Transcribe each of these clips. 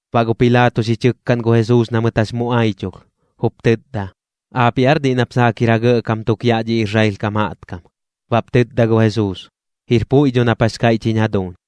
Baꞌ gu Pilaato xi chɨkkaꞌn gu Jesuus na mɨt jax mu aichulh, jup tɨtda: ―¿Aapiꞌ aar diꞌ nap saak jir ja gɇꞌkam tuk yaꞌ dhi Israel kam jaꞌtkam? Baꞌp tɨtda gu Jesuus: ―Jir puiꞌ dho nap jax kaiꞌch jiñ jaduuñ.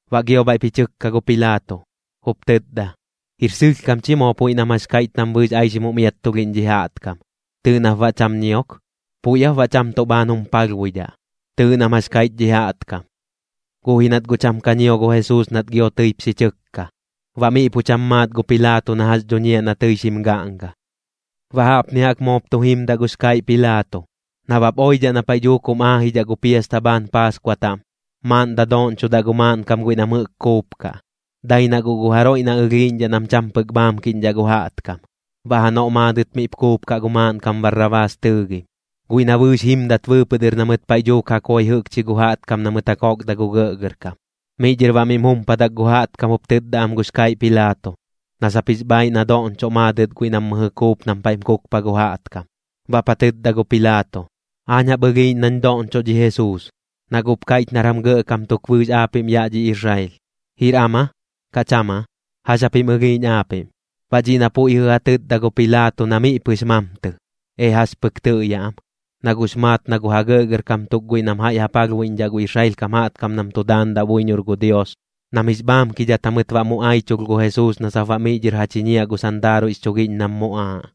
Baꞌ gio bhaiꞌp ji chɨkka gu Pilaato, jup tɨtda: ―Jir sɨlhkam chi moo puiꞌ nam jax kaiꞌch nam bɨɨx aixim jum iattulhiꞌñ dhi jaꞌtkam. Tɨɨꞌ nap baꞌ cham ñiok. ¿Puiꞌ aap baꞌ cham tuꞌ bhaan jum palhbuidhaꞌ? Tɨɨꞌ nam jax kaiꞌch dhi jaꞌtkam. Guꞌ ji nat guꞌ cham ka ñio gu Jesuus nat gio tɨip xi chɨkka. Baꞌ miꞌ pu cham maat gu Pilaato na jax dhuñiaꞌ na tɨi xim gaꞌnga. Baꞌ jaꞌpni jaꞌk moop tu jimdaꞌ gux kaiꞌ Pilaato: Nabap oidhaꞌ na paiꞌ dhuuk jum aajidhaꞌ gu piasta bhaan Paaskua taꞌm, maaꞌn dadoꞌñchoꞌ gu maaꞌnkam guiꞌ nam jɨꞌk kuupkaꞌ, dai na guꞌ gu jaroiꞌ na ɨlhiiꞌñdhaꞌ nam cham pɨk bhaamkiꞌñdhaꞌ gu jaꞌtkam. Baꞌ janoꞌ maadɨt miꞌp kuupkaꞌ gu maaꞌnkam Barrabaas tɨɨgim, guiꞌ na bɨɨx jimdat bɨɨpɨꞌ dɨr na mɨt paiꞌ dhuuk ja koi jɨꞌkchi gu jaꞌtkam na mɨt ja kokda gu gɇꞌgɇrkam. Miꞌ dhɨr baꞌ miꞌm jumpadak gu jaꞌtkam jup tɨtda am gux kaiꞌ Pilaato, na sap jix bhaaiꞌ na doꞌñchoꞌ maadɨt guiꞌ nam mɨjɨ kuup nam paiꞌm kukpa gu jaꞌtkam. Baꞌp ja tɨtda gu Pilaato: ―Aañ jaꞌp ɨlhiiꞌñ nañ doꞌñchoꞌ dhi Jesuus, na guꞌp kaiꞌch nar jam gɇꞌkam tuk bɨɨx aapiꞌm yaꞌ dhi Israel. ¿Jir am aa, kaꞌ cham aa? ¿Jax japim ɨlhiiꞌñ aapiꞌm? Baꞌ dhiꞌ na puiꞌ jɨꞌ ja tɨtda gu Pilaato na miꞌ pɨx mamtɨ, ee jax pɨk tɨꞌyaꞌ am. Na guꞌx maat na gu ja gɇꞌgɇrkam tuk guiꞌ nam jaiꞌ ja palhbuiꞌñdhaꞌ gu Israel kam jaꞌtkam nam tu daandaꞌ buiñor gu Dios, nam jix bhaamkidhat jamɨt baꞌ mu aichulh gu Jesuus na sap baꞌ miꞌ dhɨr ja chiñiaꞌ gu sandaaruiꞌx chugiꞌñ nam muꞌaaꞌ,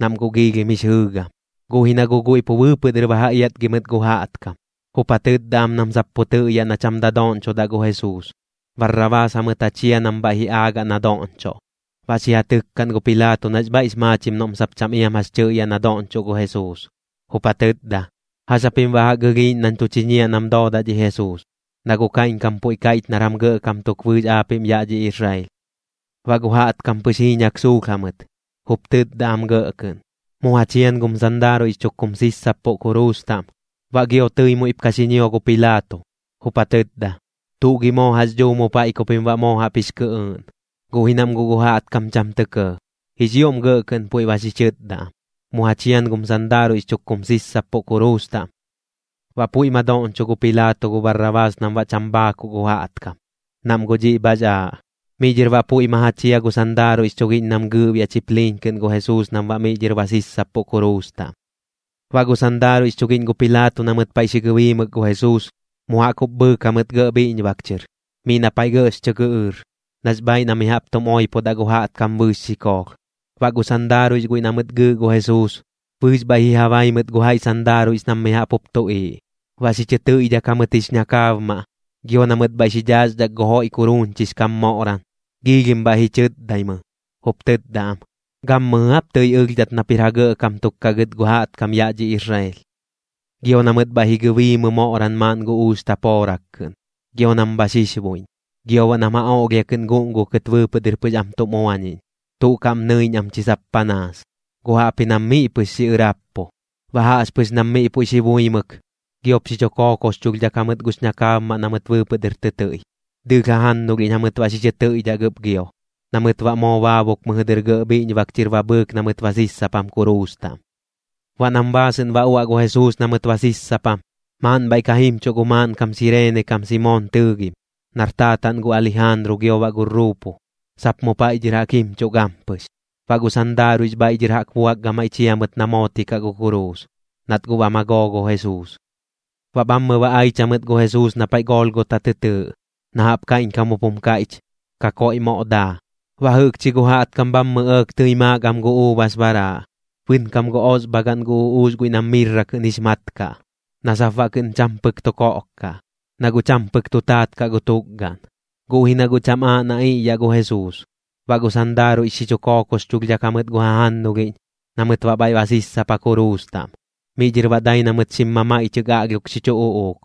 nam guꞌ giilhim jix jɨɨgam. Guꞌ ji na guꞌ guiꞌ pu bɨɨpɨꞌ dɨr ba ja iatgi mɨt gu jaꞌtkam, jup ja tɨtda am nam sap puiꞌ tɨꞌyaꞌ na cham dadoꞌñchodaꞌ gu Jesuus, Barrabaas jamɨt ja chia nam bhaiꞌ ji aagaꞌ na doꞌñchoꞌ. Baꞌ xi ja tɨkkaꞌn gu Pilaato nax bhaiꞌx maachim noꞌm sap cham iam jax tɨꞌyaꞌ na doꞌñchoꞌ gu Jesuus, jup ja tɨtda: ―¿Jax japim baꞌ jaꞌk ɨlhiiꞌñ nañ tu chiñiaꞌ nam doodaꞌ dhi Jesuus? Na guꞌ kaiꞌñkam puiꞌ kaiꞌch nar jam gɇꞌkam tuk bɨɨx aapiꞌm yaꞌ dhi Israel. Baꞌ gu jaꞌtkam pɨx jiiñak suulh jamɨt, jup tɨtda am gɇꞌ kɨꞌn: ―¡Mu ja chian gum sandaaruiꞌx chuk kum sissappuꞌ kuruus taꞌm! Baꞌ gio tɨi muiꞌp ka xi ñio gu Pilaato, jup ja tɨtda: ―¿Tuꞌ gi moo jax dhuu mu paiꞌ ku pim baꞌ moo jaꞌp jix kɨꞌɨɨꞌn? Guꞌ ji nam guꞌ gu jaꞌtkam cham tɇ kɇɇ. Jix ioꞌm gɇꞌ kɨꞌn puiꞌ ba xi chɨtda am: ―¡Mu ja chian gum sandaaruiꞌx chuk kum sissappuꞌ kuruus taꞌm! Baꞌ puiꞌ ma doꞌñcho gu Pilaato gu Barrabaas nam baꞌ cham bhaakuꞌ gu jaꞌtkam, nam guꞌ dhiꞌ bhax aaꞌ. Miꞌ dhɨr baꞌ puiꞌ ma ja chia gu sandaaruiꞌx chugiꞌñ nam gɨɨꞌbiaꞌ chipliin kɨꞌn gu Jesuus nam baꞌ miꞌ dhɨr ba sissappuꞌ kuruus taꞌm. Baꞌ gu sandaaruiꞌx chugiꞌñ gu Pilaato na mɨt paiꞌ xi gɨbiimɨk gu Jesuus, mu jaꞌk jup bhɨɨk jamɨt gɇꞌ bhiꞌñbak chɨr, miꞌ na paiꞌ gɇꞌx chɨ gɨꞌɨɨr, nax bhaaiꞌ na mi jaꞌp tum oipodaꞌ gu jaꞌtkam bɨɨx xikoolh. Baꞌ gu sandaaruiꞌx guiꞌ na mɨt gɨɨꞌ gu Jesuus, bɨɨx bhaiꞌ ji ja bai mɨt gu jaiꞌ sandaaruiꞌx nam mi jaꞌp jup tuꞌiiꞌ, baꞌ xi chɨ tɨiꞌdhak jamɨt jix ñakaabmaꞌ, gio na mɨt bhaiꞌ xi dhaaxdhak gu joiꞌ kuruuñchix kam moꞌran. Giilhim bhaiꞌ ji chɨtdaimɨ, jup tɨtda am: ―¿Gammɨjɨ aap tɨi ɨlhdhat nap jir ja gɇꞌkam tuk kaꞌ gɨt gu jaꞌtkam yaꞌ dhi Israel? Gio na mɨt bhaiꞌ ji gɨbiimɨ moꞌran maaꞌn gu uux tapoorak kɨꞌn, gio nam bha xixbuiꞌñ. Gio baꞌ nam ja oꞌlhia kɨꞌn guꞌngukɨt bɨɨpɨꞌ dɨr pɨx am tum uañiꞌñ, tuꞌ kaꞌm nɨiꞌñ am chi sap panaas, guꞌ jaꞌpji nam miꞌ pɨx xiꞌɨrappu. Baꞌ jaꞌxpɨx nam miꞌ puiꞌ xi buimɨk, giop xi chu kookoxchulhdhak jamɨt gux ñakaabmaꞌ na mɨt bɨɨpɨꞌ dɨr tɨ tɨiꞌ, dɨɨlh jajannulhiꞌñ jamɨt baꞌ xi chɨ tɨiꞌdhak ɨp gio, na mɨt baꞌ moo baabuk mɨjɨ dɨr gɇꞌ bhiꞌñbak chɨr ba bhɨɨk na mɨt ba sissapam kuruus taꞌm. Baꞌ nam baasɨꞌn ba uaꞌ gu Jesuus na mɨt ba sissapam, maaꞌn bhaiꞌ ka jimchuꞌ gu maaꞌnkam Sireene kam Simoon tɨɨgim, nar taataꞌn gu Alijaanru gio baꞌ gu Ruupu, sap mu paiꞌ dhɨr jaꞌk jimchuꞌ gampɨx. Baꞌ gu sandaaruiꞌx bhaiꞌ dhɨr jaꞌk buak gamaiꞌ chia mɨt na mootikaꞌ gu kuruus, nat guꞌ ba magoo gu Jesuus. Baꞌ bhammɨ ba aich jamɨt gu Jesuus na paiꞌ Golgota tɨ tɨɨꞌ, na jaꞌp kaiꞌñkam jup jum kaiꞌch: Kakoiꞌ Moꞌ Daa. Baꞌ jɨꞌkchi gu jaꞌtkam bhammɨ ɇɇk tɨi maak am gu uubas baraaꞌ, bɨnkam gu osbhagaꞌn gu uꞌuux guiꞌ nam mirra kɨꞌn jix mat kaꞌ, na sap baꞌ kɨꞌn cham pɨk tu koꞌk kaꞌ, na guꞌ cham pɨk tu taat kaꞌ gu tukgaꞌn, guꞌ ji na guꞌ cham aaꞌ na iꞌyaꞌ gu Jesuus. Baꞌ gu sandaaruiꞌx xi chu kookoxchulhdhak jamɨt gu jajannulhiꞌñ, na mɨt baꞌ bhaiꞌ ba sissapa kuruus taꞌm. Miꞌ dhɨr baꞌ dai na mɨt xim mamaiꞌchɨk aꞌlhiok xi chu uꞌuuk.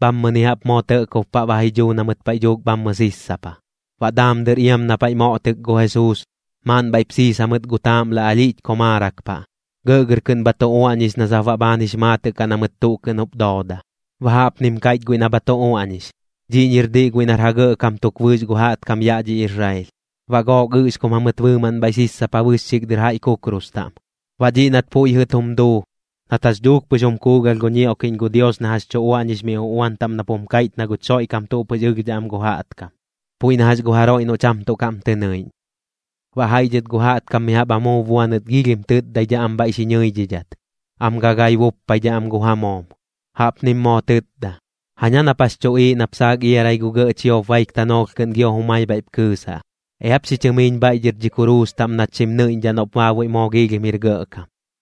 Bhammɨni jaꞌp moo tɇꞌkob paꞌ ba ji dhuu na mɨt paiꞌ dhuuk bhammɨ sissapa. Baꞌ daam dɨr iam na paiꞌ moꞌtɨk gu Jesuus, maaꞌn bhaiꞌp siis jamɨt gu taaꞌmla alhiꞌch komaarak paꞌ, gɇꞌgɇr kɨꞌn bha tu uaꞌñix na sap baꞌ bhaan jix maatɨꞌ kaꞌ na mɨt tuꞌ kɨꞌn jup dooda. Baꞌ jaꞌpnim kaiꞌch guiꞌ na bha tu uaꞌñix: “Dhiꞌñi jir diꞌ guiꞌ nar ja gɇꞌkam tuk bɨɨx gu jaꞌtkam yaꞌ dhi Israel.” Baꞌ gook ɨꞌxkum jamɨt bɨɨmaꞌn bhaiꞌ sissapa bɨxxik dɨr jaiꞌ kukrus taꞌm. Baꞌ dhiꞌ nat puiꞌ jɨꞌ tum duu, nat jax dhuuk pɨx jum kuugalh gu ñioꞌkiꞌñ gu Dios na jax tu uaꞌñix mi uꞌuan taꞌm nap jum kaiꞌch na guch Xoiꞌkam tuꞌ pɨx ɨlhdhaꞌ am gu jaꞌtkam, puiꞌ na jax gu jaroiꞌ noꞌ cham tuꞌ kaꞌm tɨ nɨiꞌñ. Baꞌ jaiꞌ dhɨt gu jaꞌtkam mi jaꞌp amuub buanɨt giilhim tɨtdaidhaꞌ am bhaiꞌ xi ñɨidhidhat, am gagai buppaidhaꞌ am gu ja moom. Jaꞌpnim moo tɨtda: ―Jaña nap jax chuꞌiiꞌ aap nap saak iarai gu gɇꞌ chiop baik tanoolh kɨꞌn gio jumai bhaiꞌp kɨɨsaꞌ. Eap xi chɨmiiñ bhaiꞌ dhɨr dhi kuruus taꞌm nach xim nɨiꞌñdhaꞌ noꞌp baabuiꞌ moox ioꞌm jir gɇꞌkam.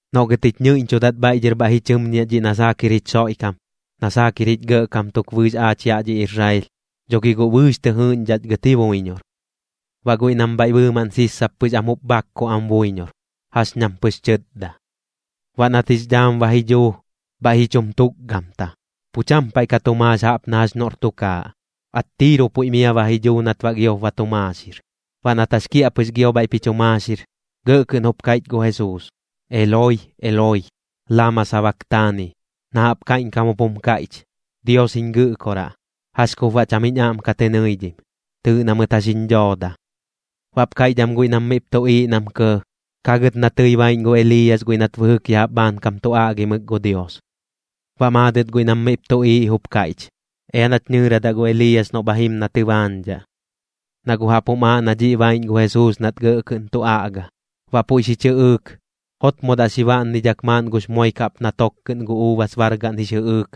Noꞌ gɨt jich ñɨiꞌñchudat bhaiꞌ dhɨr bhaiꞌ ji chɨmñiaꞌ dhiꞌ na saak jir jich Xoiꞌkam, na saak jir jich gɇꞌkam tuk bɨɨx aach yaꞌ dhi Israel, dho gi guꞌ bɨɨx tɨ jɨɨꞌñdhaꞌch gɨt ji buiñor. Baꞌ guiꞌ nam bhaiꞌ bɨɨmaꞌn sissap pɨx am jup bhakkuꞌ am buiñor, jax ñam pɨx chɨtda. Baꞌ nat jix dhaam ba ji dhuu, bhaiꞌ ji chum tukgamta, pu cham paiꞌ ka tu maax jaꞌp na jax noꞌr tukaaꞌ, attiiru puiꞌ mia ba ji dhuu nat baꞌ giop ba tu maaxir. Baꞌ nat jax kiaꞌpɨx gio bhaiꞌp ji chu maaxir, gɇꞌ kɨꞌn jup kaiꞌch gu Jesuus: ―Eloi, Eloi, ¿lama sabaktani? ―na jaꞌp kaiꞌñkam jup jum kaiꞌch: Dios jiñ Gɨꞌkoraꞌ, ¿jax kup baꞌ cham jiñ aꞌm ka tɨ nɨidhim? Tɨɨꞌ na mɨt jax jiñ dhooda. Baꞌp kaiꞌch am guiꞌ nam miꞌp tuꞌiiꞌ nam kɇɇ: ―Ka gɨt na tɨi baiꞌñ gu Eliiyas guiꞌ nat bɨjɨk ya jaꞌp bhaankam tu aꞌgimɨk gu Dios. Baꞌ maadɨt guiꞌ nam miꞌp tuꞌiiꞌ jup kaiꞌch: ―Ea nach nɨɨradaꞌ gu Eliiyas noꞌ bha jim na tɨbaañdhaꞌ. Na guꞌ jaꞌp jum aaꞌ na dhiꞌ baiꞌñ gu Jesuus nat gɇꞌ kɨꞌn tu aꞌga. Baꞌ puiꞌ xi chɨꞌɨɨk, jotmodaꞌ xi baꞌnnidhak maaꞌn gux moik jaꞌp na tok kɨꞌn gu uubas bargaꞌn jix jɨꞌɨɨk,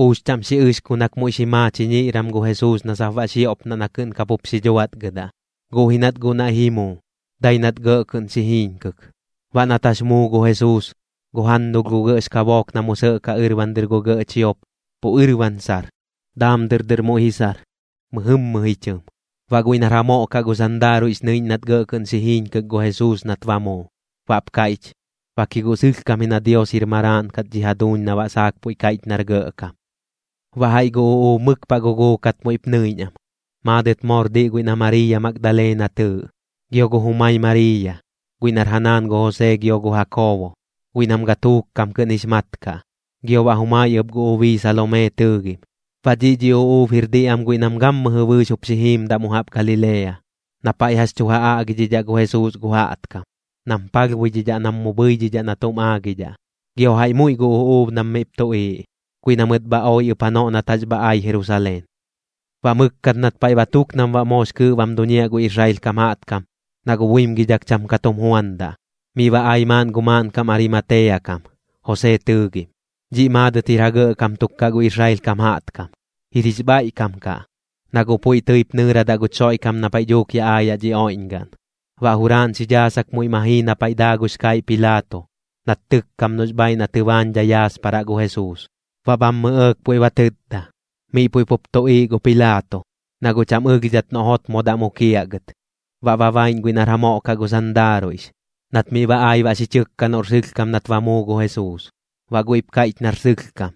uux chaꞌm xi ɨxkunak muiꞌ xi maa chiñiꞌran gu Jesuus na sap baꞌ xioꞌpnaꞌ na kɨꞌn kapup xi dhuatgɨdaꞌ. Guꞌ ji nat guꞌ naiꞌ ji muu, dai nat gɇꞌ kɨꞌn xi jiiñkɨk. Baꞌ nat jax muu gu Jesuus, gu jannulh gu gɇꞌx kabook na mu sɇꞌkaꞌ ɨrban dɨr gu gɇꞌ chiop, pu ɨrban sar. Daam dɨr dɨr muiꞌ ji sar, mɨjɨmmɨ ji chɨm. Baꞌ guiꞌ nar ja moꞌ kaꞌ gu sandaaruiꞌx nɨiꞌñ nat gɇꞌ kɨꞌn xi jiiñkɨk gu Jesuus nat ba muu, baꞌp kaiꞌch: ―Bak ji guꞌ sɨlhkam ji na Dios jir Maraaꞌn kat dhi jaduuñ na baꞌ saak puiꞌ kaiꞌch nar gɇꞌkam. Baꞌ jaiꞌ gu uꞌuub mɨk paꞌ guguukat muiꞌp nɨiꞌñ am. Maadɨt moor diꞌ guiꞌ na Mariiya Magdalena tɨɨꞌ, gio gu jumai Mariiya, guiꞌ nar ja naan gu Josee gio gu Jakoobo, guiꞌ nam gatuuk kam kɨꞌn jix mat kaꞌ, gio baꞌ jumai ɨp gu ubii Salomee tɨɨgim. Baꞌ dhiꞌ dhi uꞌuub jir diꞌ am guiꞌ nam gammɨjɨ bɨɨx jup xi jiimdaꞌ mu jaꞌp Galilea, na paiꞌ jax tu ja aꞌgidhidhaꞌ gu Jesuus gu jaꞌtkam, nam palhbuidhidhaꞌ nam mu bhɨidhidhaꞌ na tuꞌm aagidhaꞌ. Gio jaiꞌ muiꞌ gu uꞌuub nam miꞌp tuꞌiiꞌ, guiꞌ na mɨt bha oi ɨp janoꞌ nat jax bha ai Jerusaleen. Baꞌ mɨkkat nat paiꞌ ba tuk nam baꞌ moox kɨɨꞌ bam duñiaꞌ gu Israel kam jaꞌtkam, na guꞌ buimgidhak cham ka tum juandaꞌ, miꞌ ba ai maaꞌn gu maaꞌnkam Arimatea kam, Josee tɨɨgim. Dhiꞌ maadɨt jir ja gɇꞌkam tuk kaꞌ gu Israel kam jaꞌtkam. Jir jix bhaiꞌkam kaꞌ, na guꞌ puiꞌ tɨip nɨɨradaꞌ guch Xoiꞌkam na paiꞌ dhuuk yaꞌ aayaꞌ dhi oiꞌñgaꞌn. Baꞌ juraaꞌn xi dhaasak muiꞌ ma jii na paiꞌ daa gux kaiꞌ Pilaato, nat tɨkkam noꞌx bhaiꞌ na tɨbaañdhai yaasparaꞌ gu Jesuus. Baꞌ bhammɨ ɇɇk puiꞌ ba tɨtda. Miꞌ puiꞌ pup tuꞌiiꞌ gu Pilaato, na guꞌ cham ɨlhdhat noꞌ jotmodaꞌ mukiaꞌ gɨt. Baꞌ ba baiꞌñ guiꞌ nar ja moꞌ kaꞌ gu sandaaruiꞌx, nat miꞌ ai baꞌ xi chɨkka noꞌr sɨlhkam nat ba muu gu Jesuus. Baꞌ guiꞌp kaiꞌch nar sɨlhkam.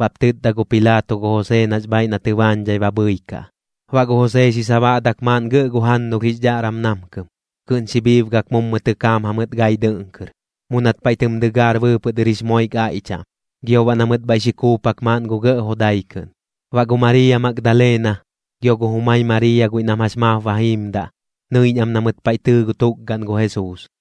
Baꞌp tɨtda gu Pilaato gu Josee nax bhaaiꞌ na tɨbaañdhai ba bhɨikaꞌ. Baꞌ gu Josee xi sabaꞌdak maaꞌn gɇꞌ gu jannulh jix dhaꞌram namkɨm, kɨꞌn xi bhiibgak mummu tɨkaam jamɨt gai dɨꞌn kɨr, mu nat paiꞌ tɨm dɨgaar bɨɨpɨꞌ dɨr jix moik aiꞌ chaꞌm, gio baꞌ na mɨt bhaiꞌ xi kuupak maaꞌn gu gɇꞌ jodai kɨꞌn. Baꞌ gu Mariiya Magdalena, gio gu jumai Mariiya guiꞌ nam jax maap ba jiimdaꞌ, nɨiꞌñ am na mɨt paiꞌ tɨɨ gu tukgaꞌn gu Jesuus.